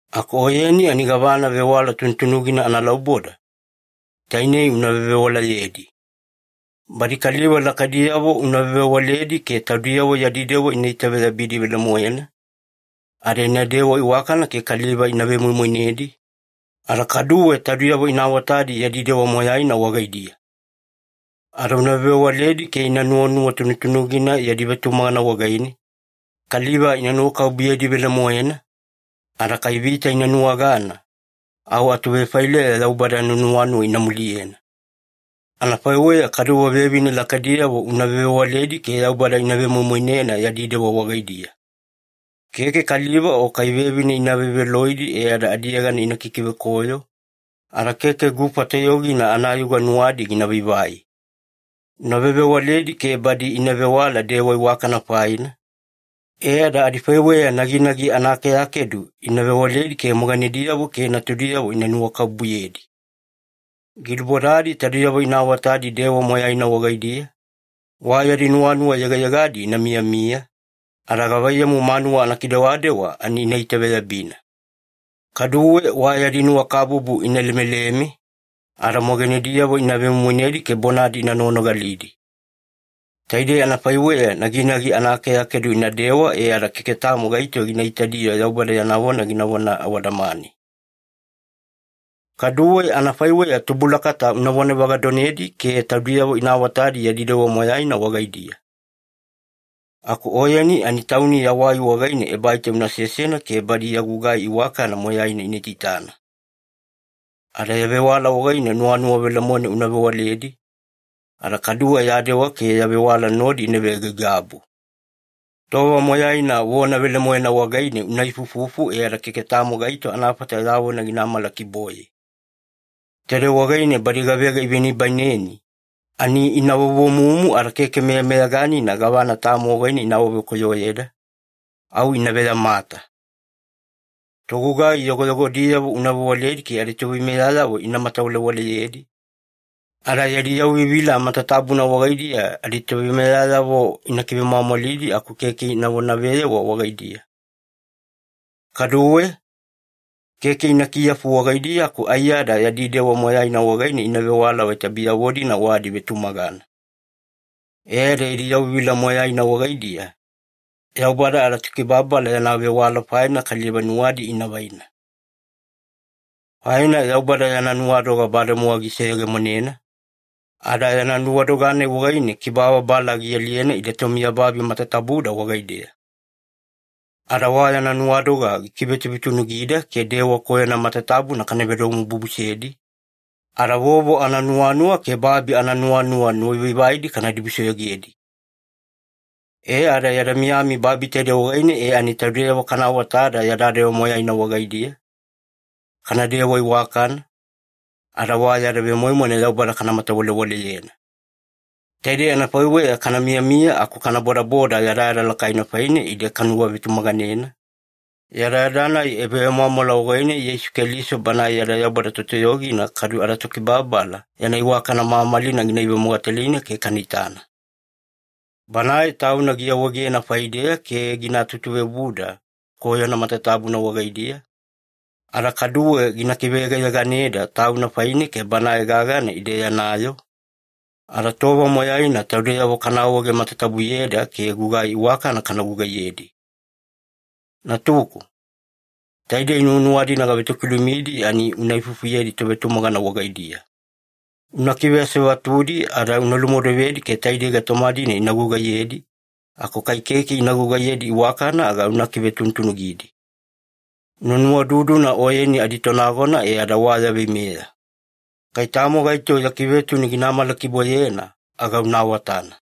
Aku oyeni ani gavana vewala tunutunugina analauboda, tainei una vevewalayedi. Badi kaliva lakaidiyavo una vevewaledi ke taudiyavo yadi dewa ina itaveyabidi velemoena, ada inadewa iwakana ke kaliva ina vemoimoinedi, ada kaduwe taudiyavo ina awatadi yadi dewa moyaina wagaidiya. Ada una vevewaledi ke ina nuwanuwa tunutunugina yadi vetumagana wagaine, kaliva ina nuwakabubuyedi velemoena, ada kai vita ina nuwagana, au atuvefaileya Yaubada yana nuwanuwa ina muliyena. Anafaiweya kaduwe vevine lakaidiyavo una vevewaledi ke Yaubada ina vemoimoinena yadi dewa wagaidiya. Keke kaliva o kai vevine ina veveloidi e ada adiyegana ina kikivekoyo, ada keke gufa toyogina anayuga nuwadi gina vaivai. Una vevewaledi ke badi ina vewala dewa iwakana faina, e ada adifaiweya naginagi anaakeakedu ina vewaledi ke moganediyavo ke natudiyavo ina nuwakabubuyedi. Gilubodadi taudiyavo ina awatadi dewa moyaina wagaidiya, wa yadi nuwanuwa yegayegadi ina miyamiya, ada gavaiyamu manuwa anakidewadewa ani ina itaveyabina. Kaduwe wa yadi nuwakabubu ina lemeleme, ada moganediyavo ina vemoimoinedi ke bonadi ina noganogalidi. Taidei anafaiweya naginagi anaakeakedu inadewa e ada keke tamo gaito gina itadi-yo Yaubada yana vona ginavona awadamane. Kaduwe anafaiweya tubulakata unavona vagadonedi ke taudiyavo ina awatadi yadi dewa moyaina wagaidiya. Aku oyeni ani tauni yawai wagaine ebaita una sesena ke badi ya gugai iwakana moyaina ina itaitana. Ada ya vewala wagaine nuwanuwa velemoena una vewaledi, ada kaduwe ya dewa ke ya vewala nodi ina veaigaigabu. Tova moyaina vona velemoena wagaine una ifuifufu e ada keke tamo gaito anafata ya vona gina amalakiboye. Taidei wagaine badi gavega ivenibaineni, ani ina vovomumu ada keke meyameyaganina gavana tamo wagaine ina awavekoyoyeda, au ina veyamata. Togugai yogoyogodiyavo una vewaledi ke aditoveimeyayavo ina matawalewaleyedi, ada yadi yauvivila matatabuna wagaidiya aditoveimeyayavo ina kivemwamwalidi aku keke ina vonaveyewa wagaidiya. Kaduwe, keke ina kiyafu wagaidiya, aku aiyada yadi dewa moyaina wagaine ina vewala vaita biyavo-dina wa adivetumagana. E ada yadi yauvivila moyaina wagaidiya, Yaubada adaTokibababala yana vewala faine kaliva nuwadi ina vaina. Faina Yaubada yana nuwadoga bademowa giseyegemonena, ada yana nuwadoga-nai wagaine kibababala gialiyena ide tomiyababi matatabuda wagaideya. Ada wa yana nuwadoga gikivetuvetunugida ke dewa koyona matatabuna kana vedomobubusedi, ada vovo ananuwanuwa ke babi ananuwanuwa nuwavaivaidi kana dibusoyogedi. E ada yada miyami babi taidei wagaine e ani taudeyavo kana awatada yada dewa moyaina wagaidiya, kanadewa iwakana, ada wa yada vemoimoina Yaubada kana matawalewaleyena. Taidei anafaiweya kana miyamiya aku kana bodaboda yadayada lakaina faine ide kanuwavetumaganena, yadayada-nai ebavemwamwala wagaine Yeisu Keliso Banae yada Yaubada Totoyogina kadu adaTokibababala yana iwakana mamalina gina ivemogatalina ke kana itana. Banae Tauna giawaegena faideya ke gina tutuveobuda koyona matatabuna wagaidiya, ada kaduwe gina kiveyegayeganeda Tauna faine ke Banae gagana ide yana yoo, ada tova moyaina taudeyavo kana awaege matatabuyeda ke gugai iwakana kana gugaiyedi. Natuku, taidei nuwanuwa-dina gavetokilumidi ani una ifufuyedi tovetumagana wagaidiya. Una kiveasevatudi ada una lumodovedi ke taidei gaitoma-dina ina gugaiyedi, aku kai keke ina gugaiyedi iwakana aga una kivetuvetunugidi. Una nuwaududuna oyeni aditonagona e ada wa ya veimeya. Kai tamo gaito ya kivetunu gina amalakiboyena, aga una awatana.